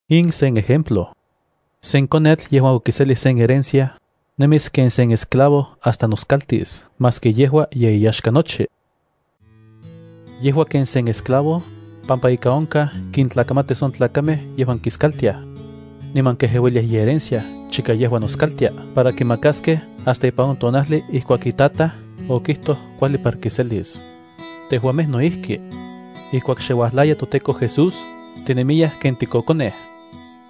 In sen ejemplo. Sen konetl yejuan okiselij sen herencia, nemis ken sen esclavo hasta noskaltis maski yejua ye iyaxka nochi. Yejua ken sen esclavo, pampa ika onkaj kintlakamatis on tlakamej yejuan kiskaltiaj. Niman kejeuiliaj iherencia chika yejua noskaltia para kimakaskej hasta ipan on tonajli ijkuak itataj okijtoj kuajli para kiselis. Tejuamej no ijki. Ijkuak xe uajlaya toTEKO Jesús, tinemiyaj ken tikokonej.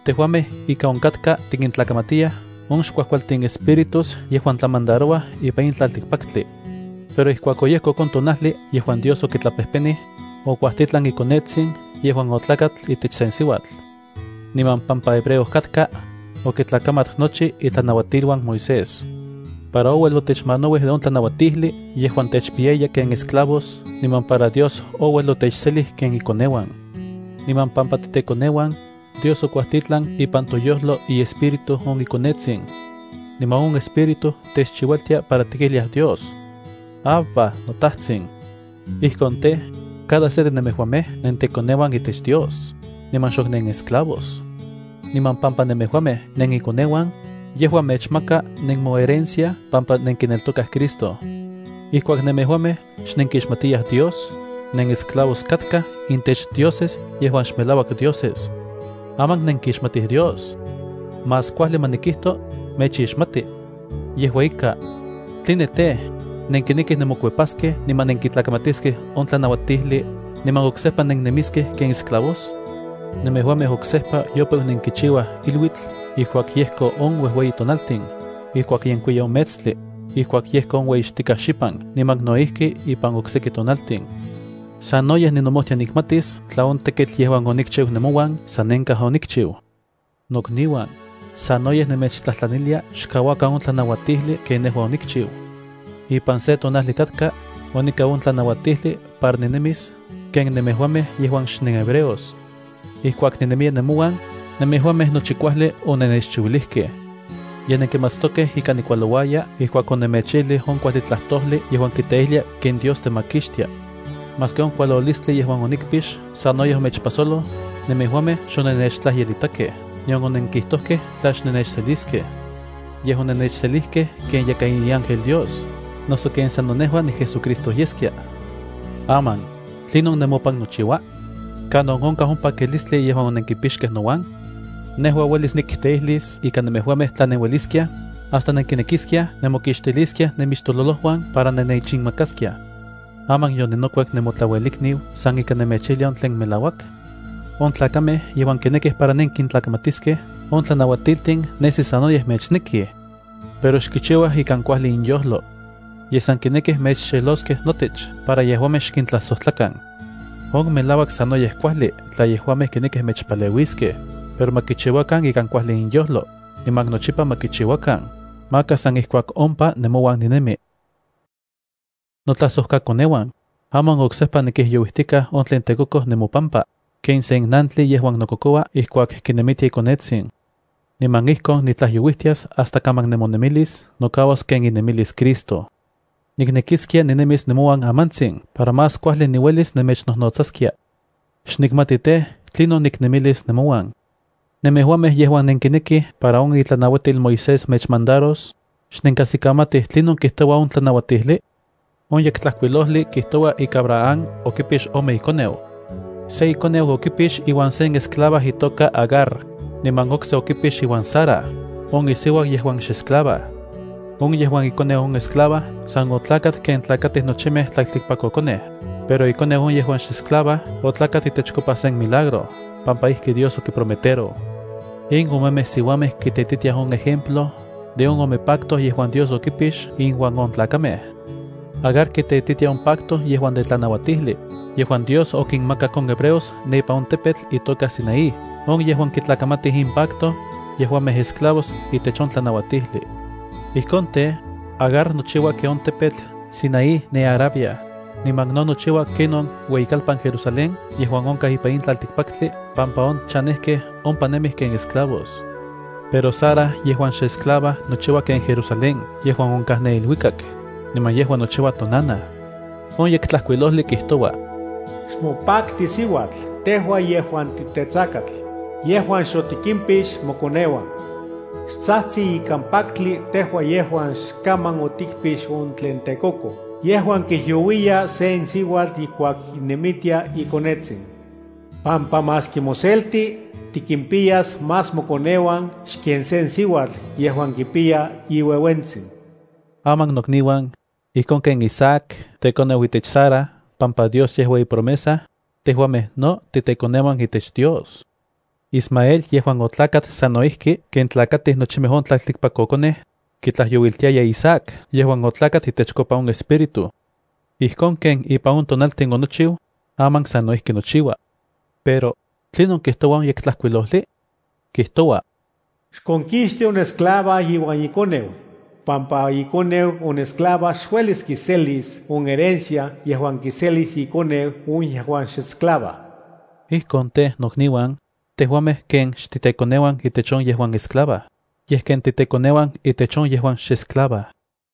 Tejuamej ika onkatka tikintlakamatiyaj on xkuajkualtin espíritus yejuan tlamandarouaj ipan in tlaltikpaktli. Pero ijkuak oyejkok on tonajli yejuan Dios okitlapejpenij, okuajtitlan iKonetsin yejuan otlakat itech sen siuatl. Niman pampa hebreo katka, okitlakamat nochi itlanauatiluan Moisés, para ouel otechmanauij de on tlanauatijli yejuan techpiyaya ken esclavos niman para Dios ouel otechselij ken ikoneuan. Niman pampa titekoneuan, Dios okuajtitlan ipan toyojlo iEspíritu on iKonetsin. Niman on Espíritu techchiualtia para tikijliaj Dios: “¡Abba, noTajtsin!” Ijkon tej, cada se de nemejuamej nentekoneuan itech Dios, niman xok nenesclavos. Niman pampa nemejuamej nenikoneuan, yejua mechmaka nemoherencia pampa nenkineltokaj Cristo. Ijkuak nemejuamej xnenkixmatiyaj Dios, nenesclavos katkaj intech dioses yejuan xmelauak dioses. Aman nenkixmatij Dios. Más kuajli ma nikijto, mechixmati. Yejua ika, ¿tline tej, nenkinekij nemokuepaskej niman nenkitlakamatiskej on tlanauatijli, niman oksejpa nennemiskej ken esclavos? Nemejuamej oksejpa yopeu nenkichiuaj iluitl ijkuak yejko on uejueyi tonaltin, ijkuak yenkuiya on metstli, ijkuak yejko on ueyixtikaj xipan niman no ijki ipan okseki tonaltin. Sanoyej ninomojtia nikmatis tla on tekitl yejuan onikchiu nemouan sanenkaj onikchiu. Nokniuan, sanoyej nemechtlajtlanilia xkauakan on tlanauatijli ken nejua onikchiu. Ipan se tonajli katka, onikau on tlanauatijli para ninemis ken nemejuamej yejuan xnenhebreos. Ijkuak ninemiya nemouan, nemejuamej nochi kuajli onennechchiuilijkej. Ye nenkimatstokej ika nikualouaya ijkuak onemechijlij on kuajli tlajtojli yejuan kiteijlia ken Dios temakixtia. Maski on kualolistli yejuan onikpix sanoyej omechpajsoloj, nemejuamej xonennechtlajyelitakej nion onenkijtojkej tla xnennechseliskej. Yej onennechselijkej ken yakaj iángel Dios, noso ken sano nejua niJesuCristo yeskia. Aman, ¿tlinon nemopan nochiua? ¿Kanon onkaj on pakilistli yejuan onenkipixkej nouan? Nejua uelis nikteijlis ika nemejuamej tla nenueliskiaj, hasta nenkinekiskiaj nemokixtiliskiaj nemixtololojuan para nennechinmakaskiaj. ¿Aman yoninokuep nemotlauelikniu san ika nemechijlia on tlen melauak? On tlakamej yejuan kinekij para nenkintlakamatiskej on tlanauatiltin nesi sanoyej mechnekij, pero xkichiuaj ikan kuajli inyojlo. Yej san kinekij mechxeloskej notech para yejuamej xkintlajsojtlakan. On melauak sanoyej kuajli tla yejuamej kinekij mechpaleuiskej, pero ma kichiuakan ikan kuajli inyojlo, niman nochipa ma kichiuakan maka san ijkuak ompa nemouan ninemi. Notlajsojkakoneuan, aman oksejpa nikijyouijtikaj on tlen tekokoj nemopampa, ken sen nantli yejuan nokokoua ijkuak kinemitia ikonetsin. Niman ijkon nitlajyouijtias hasta kaman nemonemilis nokauas ken inemilis Cristo. Niknekiskia ninemis nemouan amantsin para más kuajli niuelis nemechnojnotsaskia. Xnikmati tej, tlinon niknemilis nemouan. Nemejuamej yejuan nenkinekij para on itlanauatil Moisés mechmandaros, ¿xnenkajsikamatij tlinon kijtoua on tlanautijli? On Yektlajkuilojli kijtoua ika Abraham okipix ome ikoneu. Se ikoneu okipix iuan sen esclava itoka Agar, niman okse okipix iuan Sara, on isiuau yejuan xesclava. On yejuan ikoneu on esclava san otlakat ken tlakatij nochimej tlaltikpakkokonej, pero ikoneu on yejuan xesclava otlakat itechkopa sen milagro pampa ijki Dios okiprometeroj. In omemej siuamej kiteititiaj on ejemplo de on ome pacto yejuan Dios okipix inuan on tlakamej. Agar kiteititia on pacto yejuan de tlanauatijli, yejuan Dios okinmakak on hebreos ne ipan on tepetl itoka Sinaí. On yejuan kitlakamatij in pacto, yejuamej esclavos itech on tlanauatijli. Ijkon tej, Agar nochiua ken on tepetl Sinaí ne Arabia, niman no nochiua ken on ueyikalpan Jerusalén yejuan onkaj ipan in tlaltikpaktli pampa on chanejkej ompa nemij ken esclavos. Pero Sara yejuan xesclava nochiua ken Jerusalén yejuan onkaj ne iluikak, niman yejua nochiua tonanaj. On Yektlajkuilojli kijtoua: Xmopakti, siuatl, tejua yejuan titetsakatl, yejuan xotikimpix mokoneuan. Xtsajtsi ikan paktli tejua yejuan xkaman otikpix on tlen tekokoj yejuan kijyouiya sen siuatl ijkuak kinemitia ikonetsin. Pampa maski moselti, tikimpiyas más mokoneuan xken sen siuatl yejuan kipiya iuejuentsin. Aman nokniuan, ijkon ken Isaac tekoneu itech Sara pampa Dios yejua ipromesa, tejuamej no titekoneuan itech Dios. Ismael yejuan otlakat sano ijki ken tlakatij nochimej on tlaltikpakkokonej, kitlajyouiltiaya Isaac yejuan otlakat itechkopa on Espíritu. Ijkon ken ipan on tonaltin onochiu, aman sano ijki nochiua. Pero ¿tlinon kijtoua on Yektlajkuilojli? Kijtoua: “Xkonkixti on esclava iuan ikoneu, pampa ikoneu on esclava xuelis kiselis on herencia yejuan kiselis ikoneu on yejuan xesclava.” Ijkon tej, nokniuan, tejuamej ken xtitekoneuan itech on yejuan esclava, yej ken titekoneuan itech on yejuan xesclava.